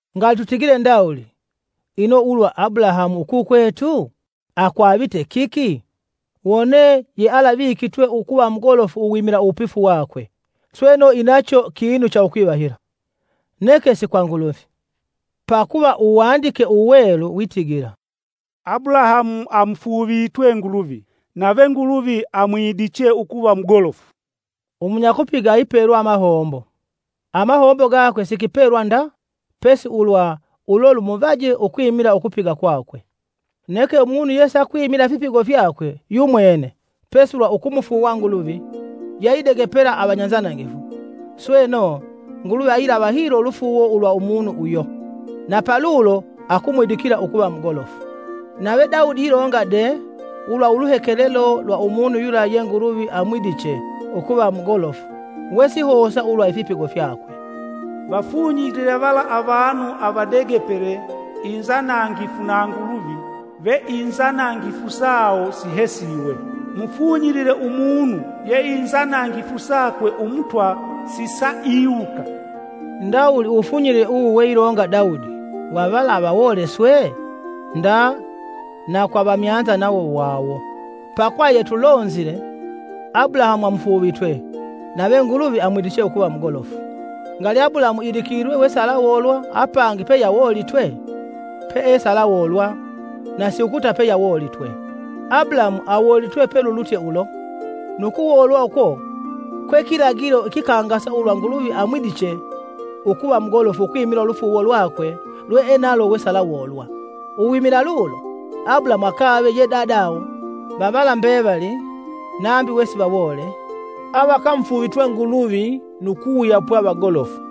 Ngali tutigile ndawuli, ino ulwa Abulahamu, ukukwetu? Akwavite kiki? Wone yealavikitwe ukuva mugolofu uwimila uwupifu wakwe, sweno inacho kinu cha ukuvahila, neke si kwa Nguluvi. Pakuva Uwandike Uwelu witigila, “Abulahamu amufuuvitwe Nguluvi, nave Nguluvi amwidiche ukuva mugolofu.” Umunyakupiga ayipelwa amahombo, amahombo gakwe si kipelwa nda pesi ulwa ulo lumuvaje ukwimila ukupiga kwakwe. Neke umunu yesakwimila ifipigo fyakwe yumwene, pesi ulwa ukumufuuwa Nguluvi yeayidegepela avanyanzanangifu, sweno, Nguluvi ayilava hilo ulufuuwo ulwa umunu uyo, na palulo akumwidikila ukuva mugolofu. Nave Daudi ilonga de ulwa uluhekelelo lwa umunu yula ye Nguluvi amwidiche ukuva mugolofu wesihosa ulwa ifipigo fyakwe. “Vafunyilile vala avanu avadegepele, inzanangifu na Nguluvi, ve inzanangifu sawo sihesiwe. Mufunyilile umunu ye inzanangifu sakwe Umutwa sisaiiwuka.” Ndawuli uwufunyilile uwu we ilonga Daudi wa vala avawole swe? Nda na kwa avamyanza nawo wawo. Pakuva yetulonzile “Abulahamu amufuuvitwe, nave Nguluvi amwidiche ukuva mugolofu.” Ngali Abulahamu idikilwe wesialawoolwa apangi peyeawoolitwe? peesalawoolwa, na siukuta peyeawoolitwe. Abulahamu awoolitwe pelulutye ulo, nu kuwoolwa uko kwe kilagilo ikikangasa ulwa Nguluvi amwidiche ukuva mugolofu ukwimila ulufuuwo lwakwe lweenalo wesialawoolwa. Uwimila lulo, Abulahamu akave ye dadawo va vala mbevali, nambi wesivawoole, avakamufuuvitwe Nguluvi nu kuwuyapwa vagolofu.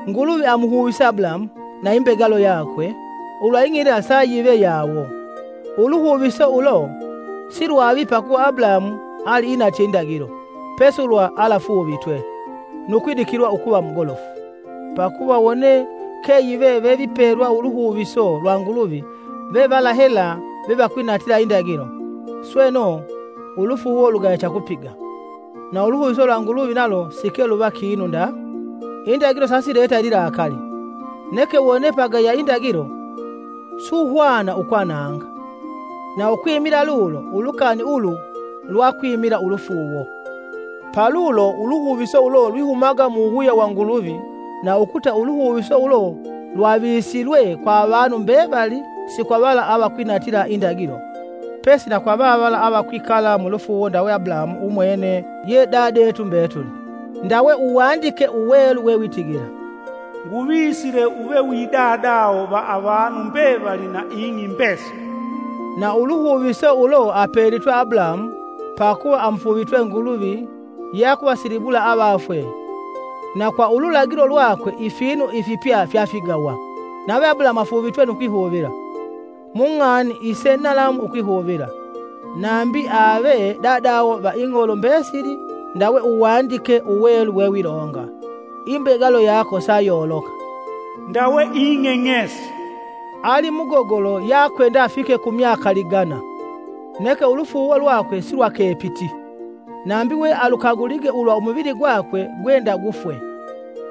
Nguluvi amuhuvise Abulahamu na imbegalo yakwe ulwa ing'i yila sa yive yawo. Uluhuviso ulo silwavi pakuva Abulahamu aliinatye indagilo, pesi ulwa alafuuvitwe, nu kwidikilwa ukuva mugolofu. Pakuva wone keyive vevipelwa uluhuviso lwa Nguluvi ve vala hela vevakwinatila indagilo, sweno, ulufuuwo lugaya cha kupiga, na uluhuviso lwa Nguluvi nalo sike luva kinu nda. Indagilo sasileta ililakali, neke wone pagaya indagilo, suhwana ukwananga. Na ukwimila lulo, ulukani ulu lwakwimila ulufuuwo, palulo uluhuviso ulo lwihumaga mu wuwuya wa Nguluvi na ukuta uluhuviso ulo lwavisilwe kwa avanu mbevali si kwa vala avakwinatila indagilo pesi na kwa vavala avakwikala mulufuuwo ndawe Abulahamu umwene ye dadetu mbetuli. Ndawe Uwandike Uwelu wewitigila, “Nguvisile uve wi dadawo va avanu mbevali na ing'i mbesili.” Na uluhuviso ulo apelitwe Abulahamu pakuva amufuuvitwe Nguluvi yeakuvasilibula avafwe na kwa ululagilo lwakwe ifinu ifipya fyafigawa. Nave Abulahamu afuuvitwe nu kwihuvila, mung'ani ise nalamu ukwihuvila, nambi ave dadawo va ing'olo mbesili ndawe Uwandike Uwelu wewilonga, imbegalo yako sayoloka, “Ndawe ing'eng'esi.” Ali mugogolo yakwenda afike ku myaka ligana, neke ulufuuwo lwakwe silwakepiti, nambi we alukagulige ulwa umuvili gwakwe gwe ndagufwe,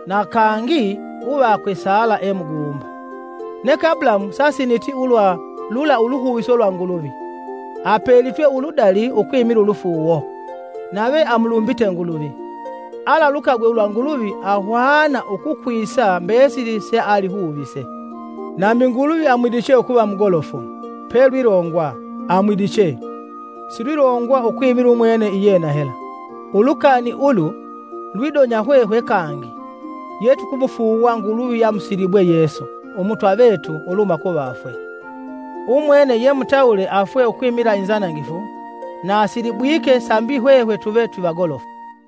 na kangi uvakwe Sala e muguumba. Neke Abulahamu sasiniti ulwa lula uluhuviso lwa Nguluvi, apelitwe uludali ukwimila ulufuuwo, nave amulumbite Nguluvi. Alalukagwe ulwa Nguluvi ahwana ukukwisa mbesili sealihuvise. Nambi Nguluvi amwidiche ukuva mugolofu, Pelwilongwa, “Amwidiche.” Silwilongwa ukwimila umwene iyena hela. Ulukani ulu lwidonya hwehwe kangi, yetukumufuuwa Nguluvi yeamusilibwe Yesu, Umutwa vetu uluhuma kuvafwe. Umwene yemutawule afwe ukwimila inzanangifu na asilibwike sambi hwehwe tuve twivagolofu.